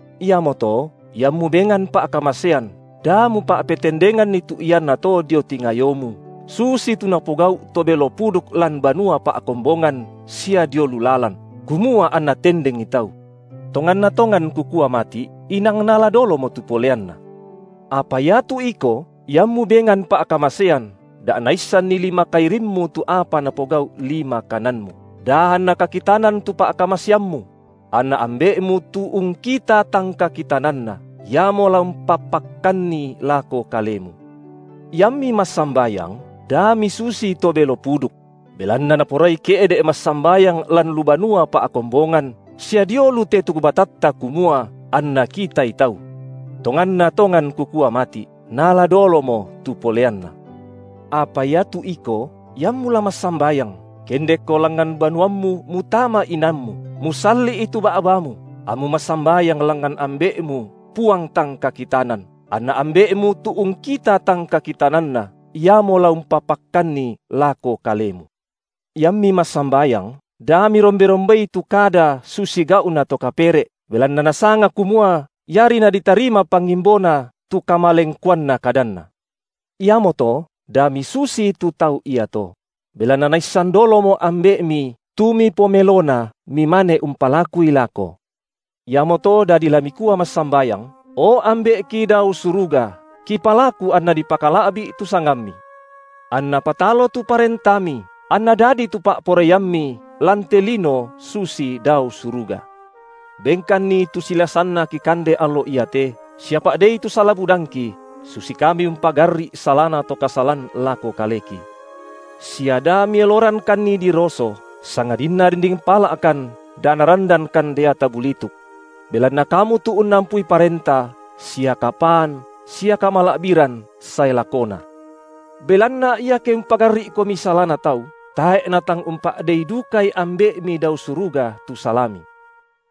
Iamoto, iammu bengan pa’kamasean, da mupa’petendenganni tu iannato dio tingayomu, susitu napogau’ to belo puduk lan banua pa’kombongan sia dio lu lalan, kumua anna tendengi tau. Tonganna tongan Kukua mati’, inang naala dolomo tu poleanna. Apa iatu iko, iammu bengan pa’kamasean, da naissanni lima kairimmu tu apa napogau’ lima kananmu, da anna kakitanan tu pa’kamaseammu; anna Ambe’mu tu ungkita tang kakitananna, Iamo la umpapakkanni lako kalemu. Iammi massambayang, da misusi to belo puduk; belanna naporai ke’de’ massambayang lan lu banua pa’kombongan sia dio lu tetuk batatta kumua anna kitai tau. Tonganna tongan Kukua mati’, naala dolomo tu poleanna. Apa iatu iko, iammu la massambayang, kendekko langngan banuammu mutama inanmu, musalli’i tu ba’bamu, ammu massambayang langngan Ambe’mu Puang tang kakitanan, anna Ambe’mu tu ungkita tang kakitananna, Iamo la umpapakkanni lako kalemu. Iammi massambayang, da mirombe-rombei tu kada susi gau’na to kapere’ belanna nasanga kumua iari naditarima pangimbona tu kamalengkoanna kadanna. Iamoto da misusitu tau iato; belanna naissan dolomo Ambe’mi tu mipomelona mimane umpalakui lako. Iamoto dadi la mikua massambayang: O Ambe’ki dao suruga, (kipalaku) anna dipakala’bi’ tu sangamMi: Anna patalo tu ParentaMi anna dadi tu pa’poraiamMi lan te lino susi dao suruga. Benkanni tu silasanna kikande allo iate sia pa’dei tu sala budangki, susi kami umpagarri’ salana to kasalan lako kaleki. Sia da Mielorangkanni diroso, sangadinna rinding pala’kan da narandankan deata bulituk. Belanna Kamu tu unnampui Parenta sia kapaan sia kamala’biran sae lakona. Belanna iake umpagarri’komi salana tau, tae’ Natang umpa’dei dukai Ambe’mi dao suruga tu salami.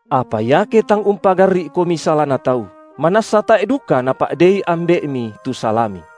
Apa iake tang umpagarri’komi salana tau, manassa tae’ duka Napa’dei Ambe’mi tu salami.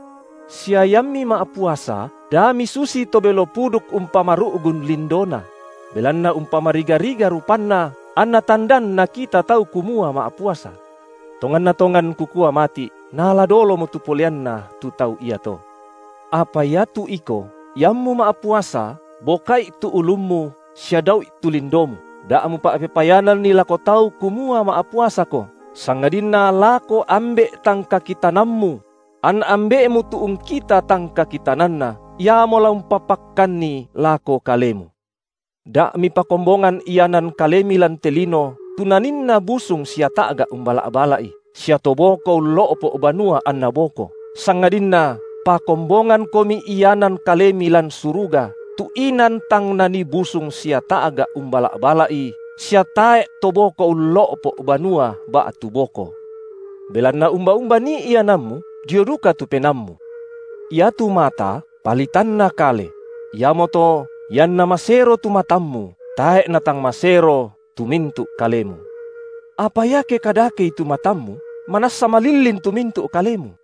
Sia iammi ma’puasa, da misusi to belo puduk umpamaru’gun lindona; belanna umpamariga-riga rupanna anna tandan nakita tau kumua ma’puasa. Tonganna tongan Kukua mati’, naala dolomo tu poleanna tu tau iato. Apa iatu iko, iammu ma’puasa, boka’i tu ulummu sia dau’i tu lindomu, da mupa’pepayananni lako tau kumua ma’puasako, sangadinna lako Ambe’ tang kakitanammu; anna Ambe’mu tu ungkita tang kakitananna, Iamo la umpapakkanni lako kalemu. Da’ mipakombongan ianan kalemi lan te lino tu naninna busung sia ta’ga’ umbala’-bala’i, sia to boko ullo’po’ banua anna boko, sangadinna pakombongangkomi ianan kalemi lan suruga, tu inan tang nanii busung sia ta’ga’ umbala’-bala’i sia tae’ to boko ullo’po’ banua ba’tu boko. Belanna umba-umba nii iananmu, dio duka tu penaammu. Iatu mata, palitanna kale; iamoto, ianna masero tu matammu, tae’ natang masero tu mintu’ kalemu. Apa iake kadakei tu matammu, manassa malillin tu mintu’ kalemu.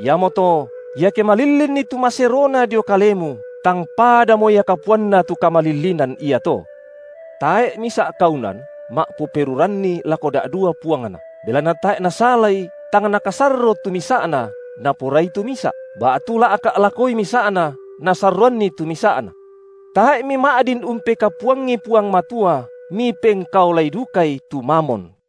Iamoto, iake malillinni tu maserona dio kalemu tang padamo ia kapuanna tu kamalillinan iato! Tae’ misa’ kaunan ma’poperuranni lako da’dua puangna, belanna tae’ nasalai tang nakasorro tu misa’na, naporai tu misa’, ba’tu la’ka’ lakoi misa’na nasarroanni tu misa’na. Tae’ mima’din umpekapuangi Puang Matua mipengkaolai dukai tu Mamon.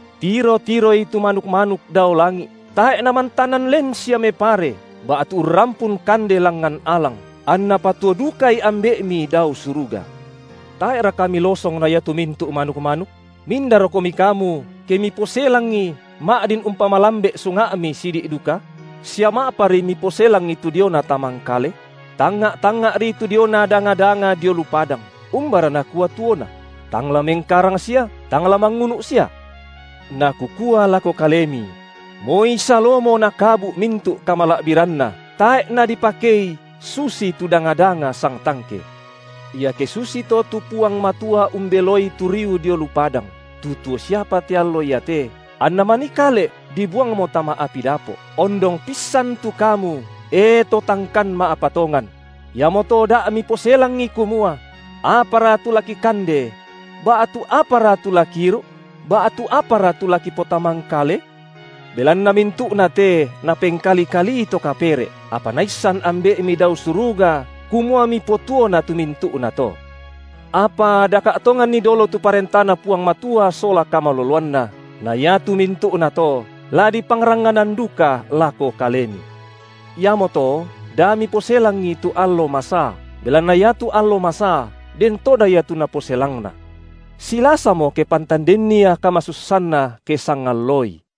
Tiro-tiroi tu manuk-manuk dao langi’, tae’ namantanan len sia mepare, ba’tu urrampun kande langngan alang, anNa patuo dukai Ambe’mi dao suruga. Tae’raka milosong na iatu mintu’ manuk-manuk? Mindarokomi kamu ke miposelangi ma’din umpamalambe’ sunga’mi sidi’ duka? Sia ma’apari miposelangi tu diona tamangkale? Tangnga’-tangnga’ri tu diona danga-danga dio lu padang, umbara nakua tuona; tang la mengkarang sia, tang la mangunu’sia. Na Kukua lako kalemi: Moi Salomo nakabu’ mintu’ kamala’biranna, tae’ nadipakei susitu danga-danga sangtangke. Iake susito tu Puang Matua umbeloi tu riu dio lu padang, tu tuo siapa te allo iate, anna manikale’ dibuangmo tama api dapo’, ondong pissan tu kamu, e to tangkan ma’patongan? Iamoto da miposelangi, kumua: Apara tu la kikande? ba’tu: Apara tu la kiiru’? ba’tu: Apara tu la kipotamangkale? Belanna mintu’na te napengkali-kalii to kapere’, apa Naissan Ambe’mi dao suruga kumua mipotuona tu mintu’nato. Apa daka’ tonganni dolo tu ParentaNa Puang Matua sola kamaloloanNa, na iatu mintu’nato, la dipangrangnganan duka lako kalemi. Iamoto da miposelangi tu allo masaa, belanna iatu allo masaa den toda ia tu naposelangna. Silasamo ke pantan denni ia kamasussanna ke sangallooi.